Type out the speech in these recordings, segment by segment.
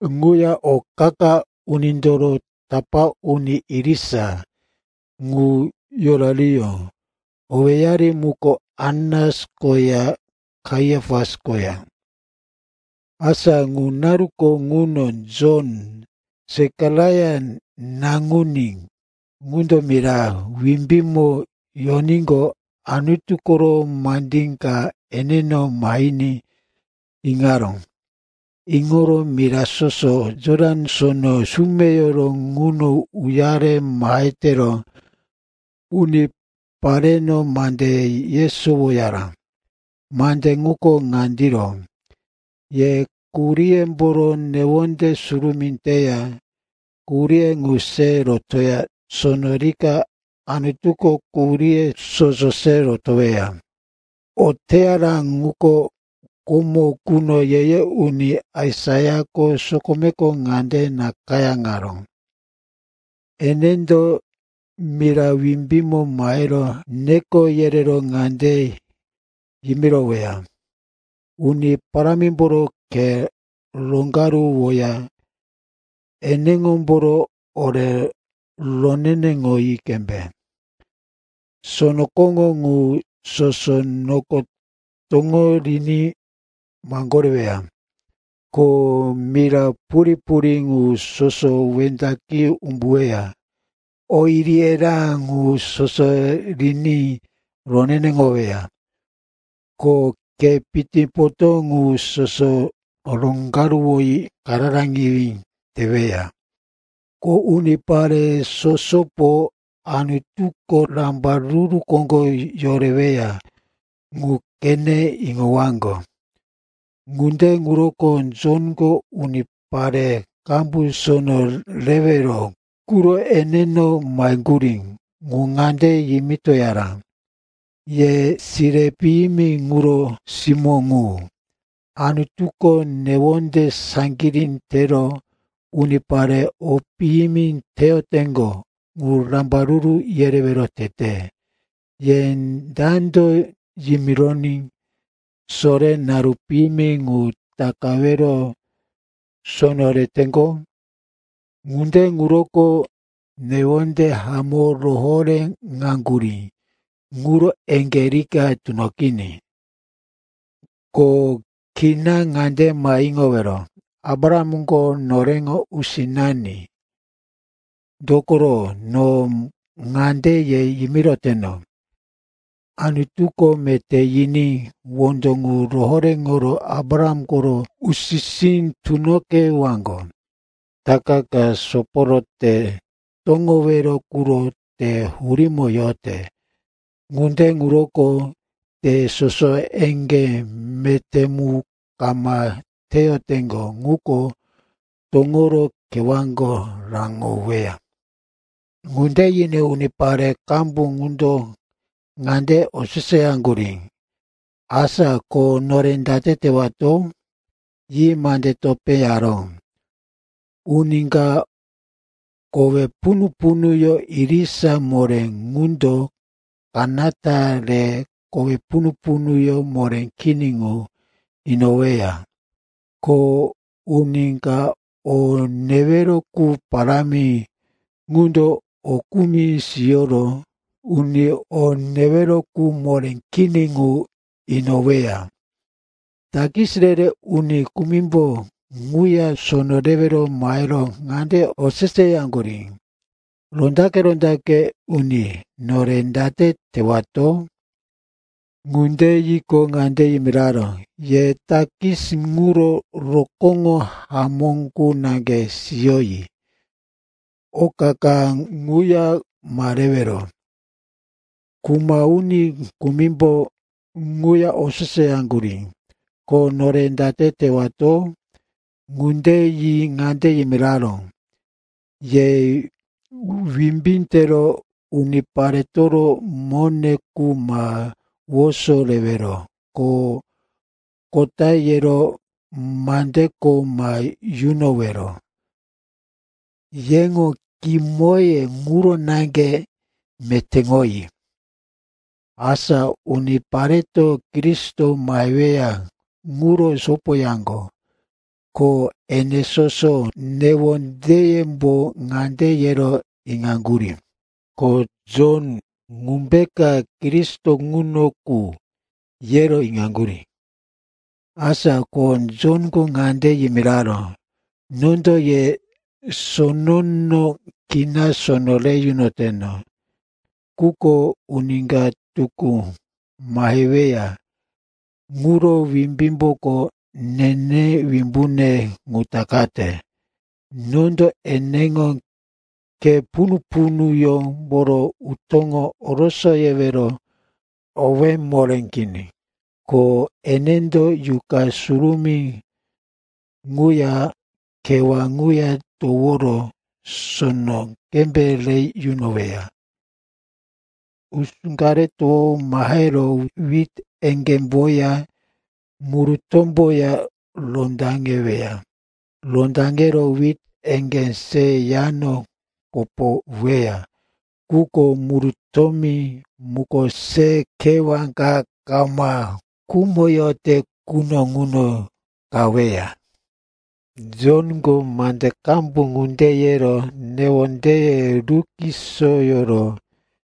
Ŋuya o qa-qa unindoro tapá uni irisa ŋu yorariyó. Owéyari muko Anas koya Kaiapas koya. Asa ŋu naruko ŋuno Jon, Sekaraia naŋuní, ŋundo mira wimbímo yoníqo, Anutu koro mande ka eneno mahiní iŋaró. Iŋoro mira soso Jotan Sono sumeyoro ŋuno uyare mahe tero unipareno mande yesowoyara. Mande ŋuko ŋandiro, “Ye quhuríyemboro newonde surumí teya quhurí ŋu se rotoya, sono rika Anutuko quhuríye soso se rotoweya.” O teyara ŋuko, komo quno ye-ye uni Aisaiako sokomeko ŋande nakayáŋaró, “Enendo mira wimbímo mahero neko yerero ŋande yimiroweya, ‘Uni Parámimboro khe roŋgaruwoya eneŋomboro ore roneneŋoyi qembe.’ Sono koŋó ŋu soso noko toŋo riní maŋgoreweya, ko mira purí-purí ŋu soso wendaqi umbuweya, o iri-erá ŋu soso riní roneneŋoweya, ko khe pitipotó ŋu soso roŋgaruwoyi kararaŋiwí teweya. Ko unipare sosopo Anutuko rambaruru koŋgo yoreweya ŋu qene iŋowaŋgo.” Ŋunde ŋuroko Jonko unipare qambu sono rewero quro eneno maheŋgurí ŋu ŋande yimitoyaró, “Ye sire piyimi ŋuro simó ŋu! Anutuko newonde saŋgirí tero unipare o piyimi teyoteŋgo ŋu rambaruru yerewero tete. Ye dando yimironí sore naru piyimi ŋu takawero sono reteŋgo? Ŋunde ŋuroko newonde hamó rohoréŋaŋgurí ŋuro eŋgé rika tunoqiní. Ko kina ŋande ma iŋowero, ‘Abrahamko noreŋo usinani.’ Dokoro no ŋande ye yimiroteno, Anutuko meté yiní wondo ŋu rohoréŋoro Abraham koro usi-sí tunoqewaŋgo. Itaka ka soporo te toŋowero quro te hurímo yote. Ŋunde ŋuroko te soso eŋgé meté mu kama teyoteŋgo ŋuko toŋoro kewáko raŋoweya.” Ŋunde yiní unipare qambu ŋundo ŋande oseseyaŋgurí, “Asa ko nore date tewato?” Yi mande topé yaró, “Uni ka kowe punu-punuyó irisa moré ŋundo kanata re kowe punu-punuyó moré kini ŋu inoweya. Ko uni ka o newero qu parámi ŋundo o kumi siyoro uni o newero qu moré kini ŋu inoweya.” Takis re-re uni kumimbo ŋuya sono rewero mahero ŋande oseseyaŋgurí, “Rondaqe-rondaqe uni, nore date tewato?” Ŋunde yiqo, ŋande yimiraró, “Ye takis ŋuro rokóŋo hamó qu naŋge siyoyi. Oka ka ŋuya ma rewero.” Kuma uni kumimbo ŋuya oseseyaŋgurí, “Ko nore date tewato?” Ŋunde yi ŋande yimiraró, “Ye wimbí tero uniparetoro mone qu ma woso rewero, ko kota yero mande kho ma yunowero. Yeŋo kimoye ŋuro naŋge metéŋoyi.” Asa unipareto Kristo maheweya ŋuro sopoyaŋgo, ko ene soso newondeyembo ŋande yero iŋaŋgurí, ko Jon ŋumbeka Kristo ŋuno qu, yero iŋaŋgurí Asa ko Jonko ŋande yimiraró, “Nondo ye sonono kina sono re yunoteno. Quko uni ka tukú maheweya ŋuro wimbímboko nene wimbune ŋu takate. Nondo eneŋo khe punu-punuyómboro utó orosoyewero owé moré kini. Ko enendo Yuqa Surumí ŋuya kewá ŋuya toworo sono qembe re yunoweya. Usú ka re towo mahero wit eŋgémboya murutómboya rondaŋeweya. Rondaŋero wit eŋgé se yano kopoweya. Quko murutómi muko se kewá ka kama khumoyote quno ŋuno qaweya.” Jonko mande qambu ŋunde yero newondeye rukisoyoro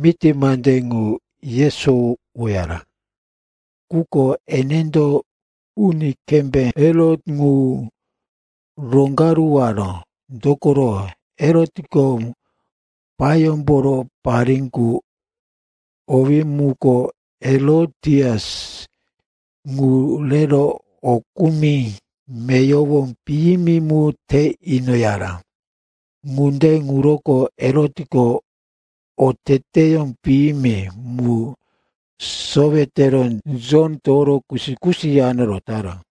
miti mande ŋu yesowoyara. Quko enendo uni kembé Herot ŋu roŋgaruwaró, dokoro Herotko payómboro parí qu, owí muko Herotias, ŋu rero o kumi meyowo piyimi mu te inoyaró. Ŋunde ŋuroko Herotko oteteyó piyimi mu sowe tero Jon toworo kusi-kusi yano rotaró.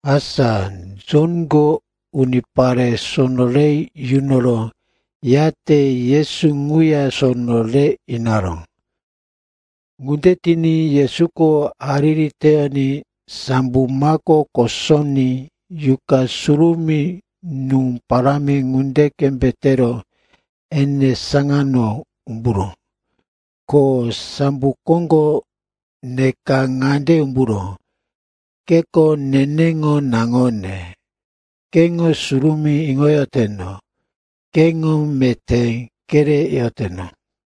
Asa Jonko unipare sono re yunoro, yate Yesu ŋuya sono re inaró. Ŋunde tiní Yesuko hariri teyoní sambo mako kosoní Yuqa Surumí nú parámi ŋunde qembe tero ene saŋano umburó. Ko sambo koŋgo neka ŋande umburó, “Keko neneŋo naŋone, keŋo surumí iŋoyoteno. Keŋo meté kereyoteno.”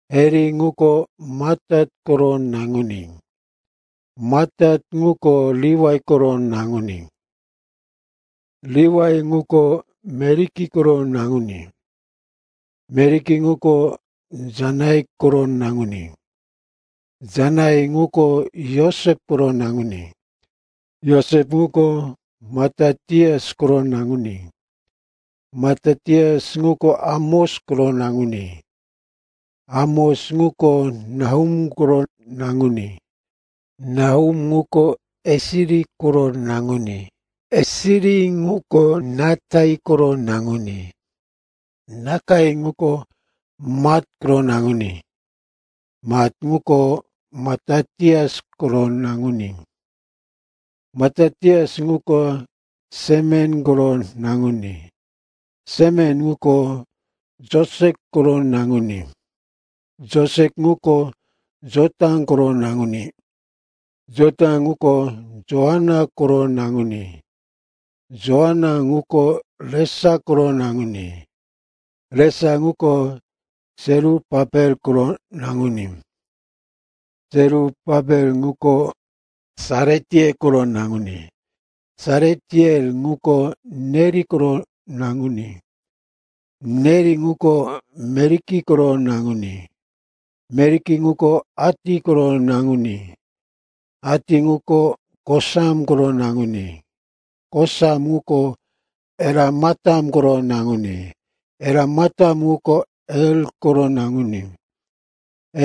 Heli ŋuko Matat koro naŋuní. Matat ŋuko Liwai koro naŋuní. Liwai ŋuko Meliki koro naŋuní. Meliki ŋuko Janai koro naŋuní. Janai ŋuko Josep koro naŋuní. Josep ŋuko Matatias koro naŋuní. Matatias ŋuko Amos koro naŋuní. Amos ŋuko Nahum koro naŋuní. Nahum ŋuko Esili koro naŋuní. Esili ŋuko Nakai koro naŋuní. Nakai ŋuko Mat koro naŋuní. Mat ŋuko Matatias koro naŋuní. Matatias ŋuko Semen koro naŋuní. Semen ŋuko Josek koro naŋuní. Josek ŋuko Jota koro naŋuní. Jota ŋuko Joanan koro naŋuní. Joanan ŋuko Resa koro naŋuní. Resa ŋuko Serupapel koro naŋuní. Serupapel ŋuko Sealitiel koro naŋuní. Sealitiel ŋuko Neri koro naŋuní. Neri ŋuko Meliki koro naŋuní. Meliki ŋuko Ati koro naŋuní. Ati ŋuko Kosam koro naŋuní. Kosam ŋuko Elamatam koro naŋuní. Elamatam ŋuko Er koro naŋuní.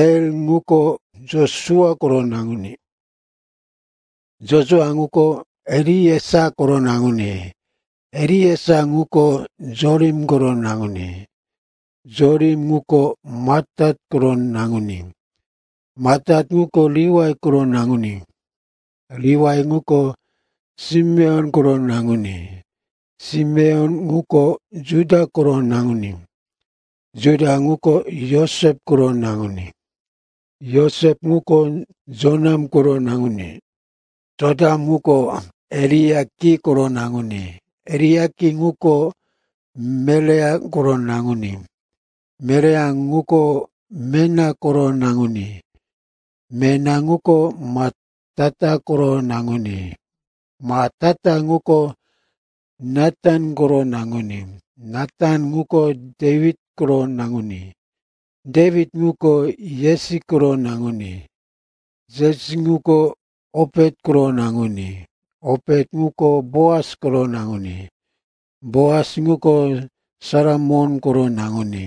Er ŋuko Josua koro naŋuní. Josua ŋuko Eliesa koro naŋuní. Eliesa ŋuko Jorim koro naŋuní. Jorim ŋuko Matat koro naŋuní. Matat ŋuko Liwai koro naŋuní. Liwai ŋuko Simeon koro naŋuní. Simeon ŋuko Juda koro naŋuní. Juda ŋuko Josep koro naŋuní. Josep ŋuko Jonam koro naŋuní. Jonam ŋuko Eliakim koro naŋuní. Eliakim ŋuko Melea koro naŋuní. Melea ŋuko Mena koro naŋuní. Mena ŋuko Matata koro naŋuní. Matata ŋuko Natan koro naŋuní. Natan ŋuko Dewit koro naŋuní. Dewit ŋuko Jesi koro naŋuní. Jesi ŋuko Opet koro naŋuní. Opet ŋuko Boas koro naŋuní. Boas ŋuko Salamon koro naŋuní.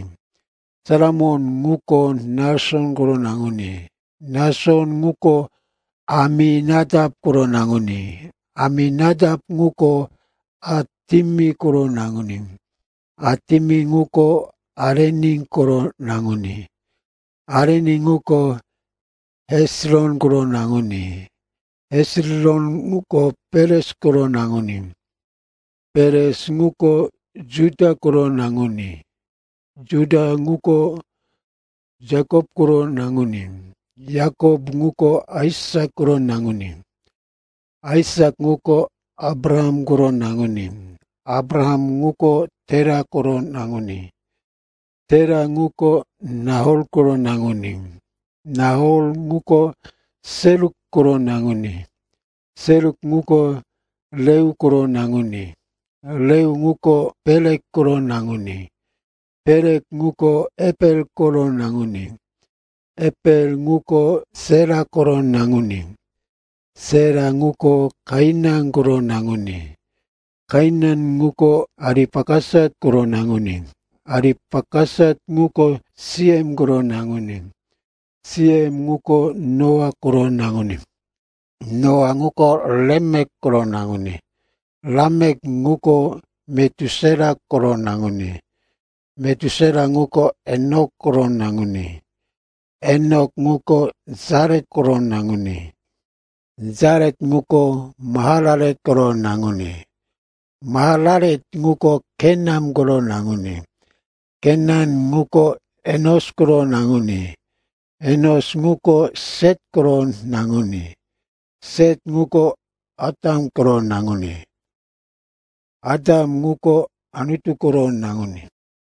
Salamon ŋuko Nason koro naŋuní. Nason ŋuko Aminatap koro naŋuní. Aminatap ŋuko Atimin koro naŋuní. Atimin ŋuko Areni koro naŋuní. Areni ŋuko Hesiron koro naŋuní. Hesiron ŋuko Peres koro naŋuní. Peres ŋuko Juda koro naŋuní. Juda ŋuko Yakop koro naŋuní. Yakop ŋuko Aisak koro naŋuní. Aisak ŋuko Abraham koro naŋuní. Abraham ŋuko Tera koro naŋuní. Tera ŋuko Nahor koro naŋuní. Nahor ŋuko Seruk koro naŋuní. Seruk ŋuko Reu koro naŋuní. Reu ŋuko Pelek koro naŋuní. Pelek ŋuko Eper koro naŋuní. Eper ŋuko Sela koro naŋuní. Sela ŋuko Kainan koro naŋuní. Kainan ŋuko Aripakasat koro naŋuní. Aripakasat ŋuko Siem koro naŋuní. Siem ŋuko Noa koro naŋuní. Noa ŋuko Lamek koro naŋuní. Lamek ŋuko Metusela koro naŋuní. Metusela ŋuko Enok koro naŋuní. Enok ŋuko Jaret koro naŋuní. Jaret ŋuko Mahalalel koro naŋuní. Mahalalel ŋuko Kenan koro naŋuní. Kenan ŋuko Enos koro naŋuní. Enos ŋuko Set koro naŋuní. Set ŋuko Atam koro naŋuní. Atam ŋuko Anutu koro naŋuní.